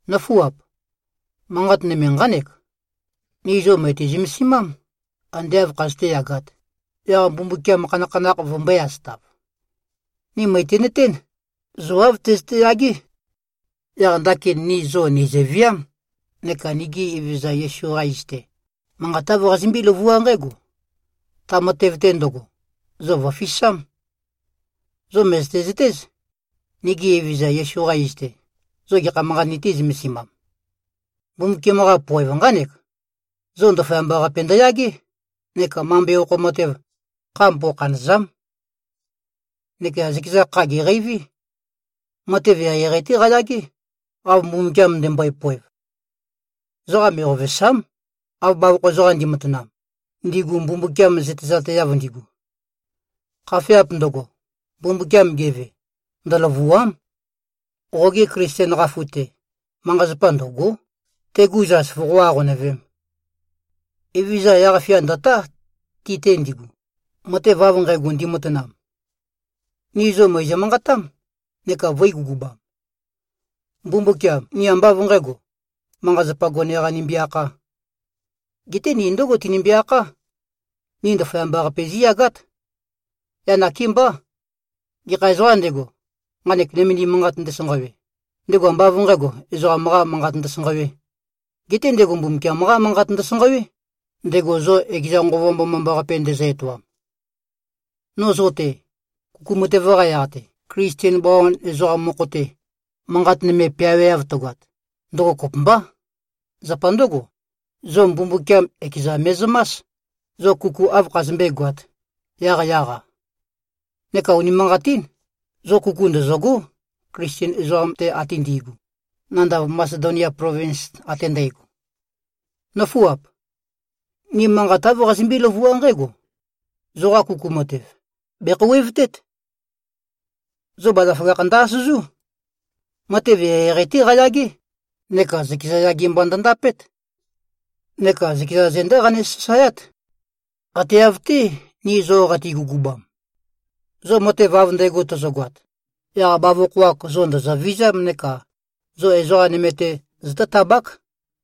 Nǿfuap! Manqat nøme nqánek: Ni zo mø̀ti-zømesimám, ande āv khazøté-yagāt, yaq Mbumbukiam khanakhanakh vømbøé-asøtāv. Ni mø̀tinøtén, zo āv tøzøte-yagé. Yaq ndakin ni zo nìzøviám, neka nigi Evezøza Yesu-qa iz-te, manqat āv qazimbí-løvuá nqǽgo: Ta matev-te ndøgo, zo vø̀fisám. Zo mø̀zøte-zøtéz, nigi Evezøza Yesu-qa iz-te, zo gekha manqat nitī-zømesimam. Mbumbukiam-qa poev nqánek: Zo ndaføyamba-qape ndøyagé neka mambe okho matev, kha mbokhanø̀za᷄m. Neka zøkeza kha gèqeiví. Matev eqeieqei-té qayagé, av Mbumbukiam ndømbøe-poev. Ezoqa me꞉qovèsa᷄m, av bavokho ezoqam ndi꞉matanam, ndigu Mbumbukiam zøtezateav ndigu. Khafeap ndøgo, Mbumbukiam geve, ndølø̀vua᷄m. Qoge Klisten qafu-te, manqa-zapa ndø̀go᷄, tegu zas voqó-aqonøvēm. Evezøza yaq-fia ndø̀tá, ti-te ndigu, matev av nqægo ndimatanam. Ni zo mø̀izø-manqatám, neka vø̄i-gugubam. Mbumbukiam, ni ambá av nqǣgo, manqa-zapa gone-qā nimbi-akhā. Geté ni ndǿgo tinimbi-akhá: Ni ndaføyamba-qape zíyagát. Yaq nakémbá, gekha ezoqām ndego, nqanek nømendim manqat ndesanqawe, ndego ambá av nqǣgo, ezoqam-qā manqat ndøsanqawē, geté ndego Mbumbukiam-qá manqat ndøsanqawé, ndego zo ekeza Nqova Mbomambaqape ndezø-etoam. No zo-te, kuku matev-qa yaq-te, Klisten bawan ezoqam mokho-te, manqat nøme peaweav tøgoat, ndøgo kopømbá. Zapa ndǿgo, zo Mbumbukiam ekeza me꞉zømás, zo kuku āv khazømbé-goāt, yaqyaq-a. Neka unimanqatín, zo kuku ndøzø̂gó, Klisten ezoqam-te ate ndi꞉gu, nandav Masedonia plovins ate ndægo. Nǿfuap. Ni manqat āv qazimbí-løvuá nqǽgo: Zoqa kuku matev, bèkhouwevtét. Zo bazaføgakh ndø-asøzú. Matev eqeieqei-té qayagé, neka zøkeza yage mba ndøndapét. Neka zøkeza zendá qane-sasaeát, ate av-té, ni zo qati-gugubam. Zo matev av ndægo tozogoat, yaq bavokho-ak zo ndø̀zøvizám neka zo ezoqa nøme-te zotótabák,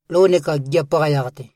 lou neka gigiap-qa yaq-te.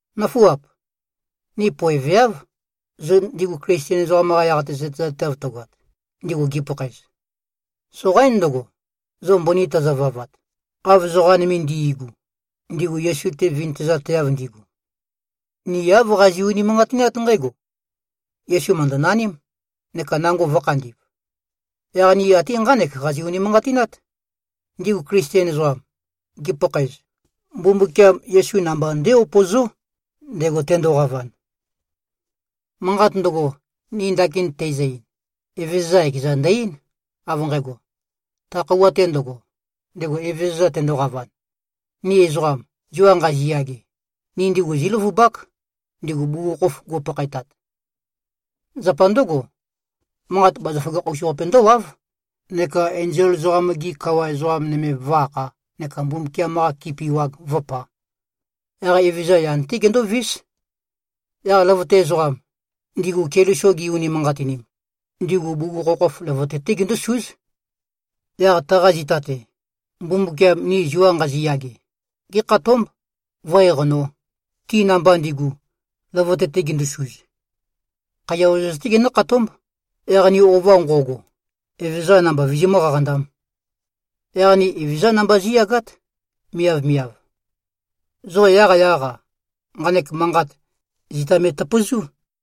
Nǿfuap! Ni poeveáv, zo ndigu Klisten ezoqam-qa yaq-te zøtezateav tøgoat, ndigu gipakhaez. Soqaín ndøgo, zo mbøni tøzøvavat, av ezoqa nøme ndi꞉gu, ndigu Yesu-te vintøzateav ndigu. Ni āv qazi꞉-unimanqatinát nqǽgo: Yesu mø̀ndønaním, neka nango vø̄khandi꞉v. Yaq ni ate nqánek qazi-unimanqatinát: Ndigu Klisten ezoqam, gipakhaez, Mbumbukiam Yesu namba ndé-upozó, ndego tendoqavan. Manqat ndøgo, ni ndakin teizø-ein, Evezøza ekeza ndø-eín, av nqægo: Ta khøuwa-te ndøgo, ndego Evezøza tendoqavan, ni ezoqam, zua nqaziyage, ni ndigu zíløvubák, ndigu bugukhokhof go꞉pakhaetat. Zapa ndǿgo, manqat bazaføgakh-us-qape ndówáv, neka enzol ezoqam-gi kawa ezoqa nøme vǿ-akhā neka Mbumbukiam-qa kipi wag vǿpā. Yaq Evezøza yan-té gendóvís. Yaq løvøte ezoqam, ndigu Keliso gi-unimanqatinim, ndigu bugukhokhof løvøte-té gindúsúz. Yaq taqa zita-te, Mbumbukiam, ni zua nqaziyage, gékhatómb, vǿ-eqanō, ti namba ndigu, løvøte-te gindusuz. Khaiya ozoz-té genǿkhatómb, yaq ni ova nqo꞉go, Evezøza namba vizimǿ-qaqandām. Yaq ni Evezøzá namba zí꞉yagát, miavmiav. Zo yaqyaq-a, nqanek manqat, zita me꞉tøpøzú.